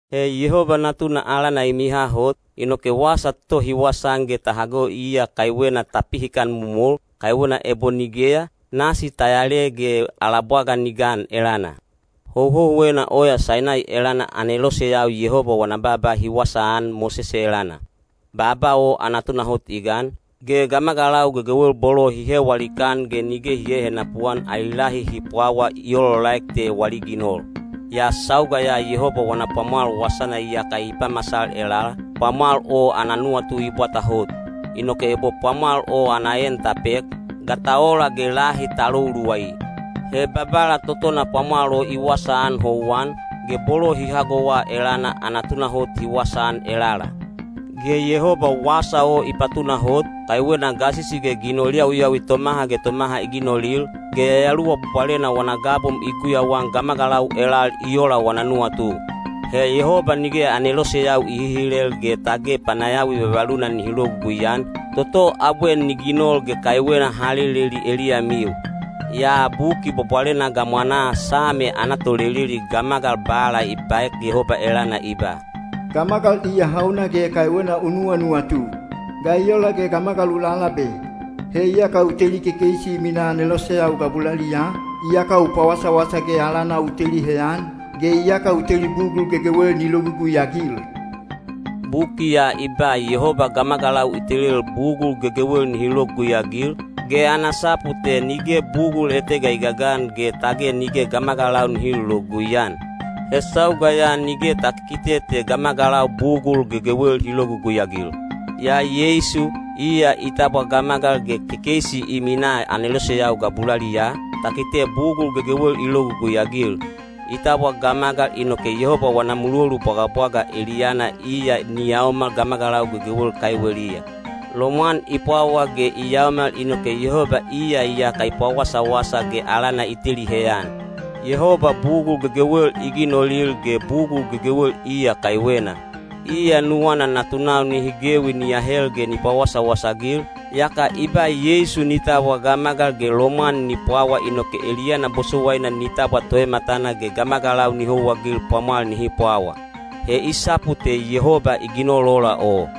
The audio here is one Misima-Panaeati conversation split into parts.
He Yehoba Natuna alana i miha hot, inoke wasa toto hi wasaan ge ta hago iya kaiwena ta pihikan momol, kaiwena ebo nigeya, nasi ta yale ge ala bwaga ni gan elana. Houhouwena oya Sainai elana aneloseyau Yehoba wana baaba hi wasaan Mosese elana. Baaba o ana tunahot i gan, ge gamagalau gegewel bolo hi hewa likaan ge nige hi hehenapu-an ali lahi hi pwawa i olaolaek te wali ginol. Yaa sauga ya Yehoba wana pwamwal wasana iyaka i pamasal elala, pwamwal o ana nuwatu i bwata hot. Inoke ebo pwamwal o ana en ta pek, ga ta ola ge lahi ta lou luwai? He Babala totona pwamwal o i wasaan houwan, ge bolo hi hagowa elana ana tunahot hi wasaan elala. Ge Yehoba wasa o i patunahot, kaiwena gasisi ge ginol yawiyawi tomaha ge tomaha i ginolil, ge Yayaluwa Bwabwalena wana gabom i guyauan gamagalau elal i ola wana nuwatu. He Yehoba nige aneloseyau i hihilel ge tage panayawi vavaluna nihi logugui-an, toto abwe ni ginol ge kaiwena ha leleli eliyamiu. Yaa Buki Bwabwalena gamwanaa Same ana toleleli gamagal bala i baek Yehoba elana i ba: Gamagal iya hauna ge kaiwena u nuwanuwatu? Ga i ola ge gamagal u lalabe? He iyaka u teli kekeisi i minaa aneloseyau gabulaliyaa, iyaka u pawasawasa ge alana u teli heyan, ge iyaka u teli bugul gegewel ni logugui-agil. Buki ya i ba Yehoba gamagalau i telel bugul gegewel nihi logugui-agil, ge ana sapu te nige bugul etega i gagan ge tage nige gamagalau nihi lologugui-an. He sauga ya nige ta kikite te gamagalau bugul gegewel hi logugui-agil. Yaa Yeisu, iya i tabwa gamagal ge kekeisi i minaa aneloseyau gabulaliyaa, ta kite bugul gegewel i logugui-agil. I tabwa gamagal inoke Yehoba wana mulolu bwagabwaga eliyana iya ni yaomal gamagalau gegewel kaiweliya. Lomwan i pwawa ge i yaomal inoke Yehoba iya iyaka i pawasawasa ge alana i teli heyan. Yehoba bugul gegewel i ginolil ge bugul gegewel iya kaiwena. Iya nuwana natunau nihi gewi ni ahel ge ni pawasawasa-agil, yaka i ba Yeisu ni tabwa gamagal ge lomwan ni pwawa inoke eliyana bosowaina ni tabwa Toematana ge gamagalau ni houwaagil pwamwal nihi pwawa. He i sapu te Yehoba i ginol ola o.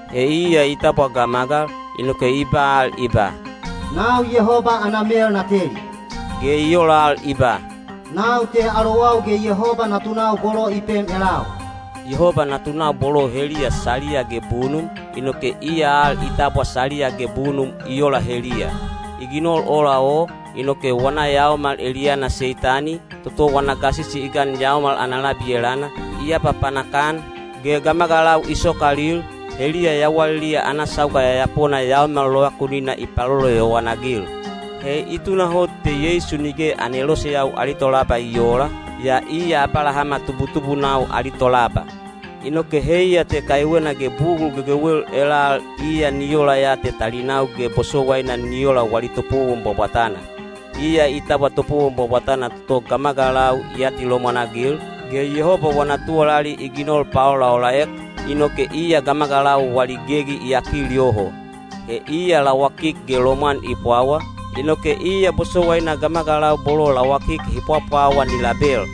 He iya i tabwa gamagal, inoke i ba al i ba, “Nau Yehoba ana mel na teli,” ge i ola al i ba, “Nau te alowau ge Yehoba natunau bolo i pem elau.” Yehoba natunau bolo o heliya saliya ge bunum, inoke iya al i tabwa saliya ge bunum i ola heliya. I ginol ola o, inoke wana yaomal eliyana Seitani, toto wana gasisi i gan yaomal ana labi elana, i apapanak-an, ge gamagalau i sokalil, heliya yawaliliya ana sauga yayapona yaomal lovakunina i paloloyowan-agil. He i tunahot te Yeisu nige aneloseyau ali tolaba i oola, yaa iya Abalahama tubutubunau ali tolaba. Inoke heiya te kaiwena ge bugul gegewel elal iya ni ola ya te talinau ge bosowaina ni ola wali topowon bwabwatana. Iya i tabwa topowon bwabwatana toto gamagalau i atilomwan-agil, ge Yehoba wana tuwalali i ginol paolaolaek, inoke iya gamagalau wali gegi i yakil yoho. He iya lawakik ge lomwan i pwawa, inoke iya bosowaina gamagalau bolo lawakik hi pwapwawa ni label.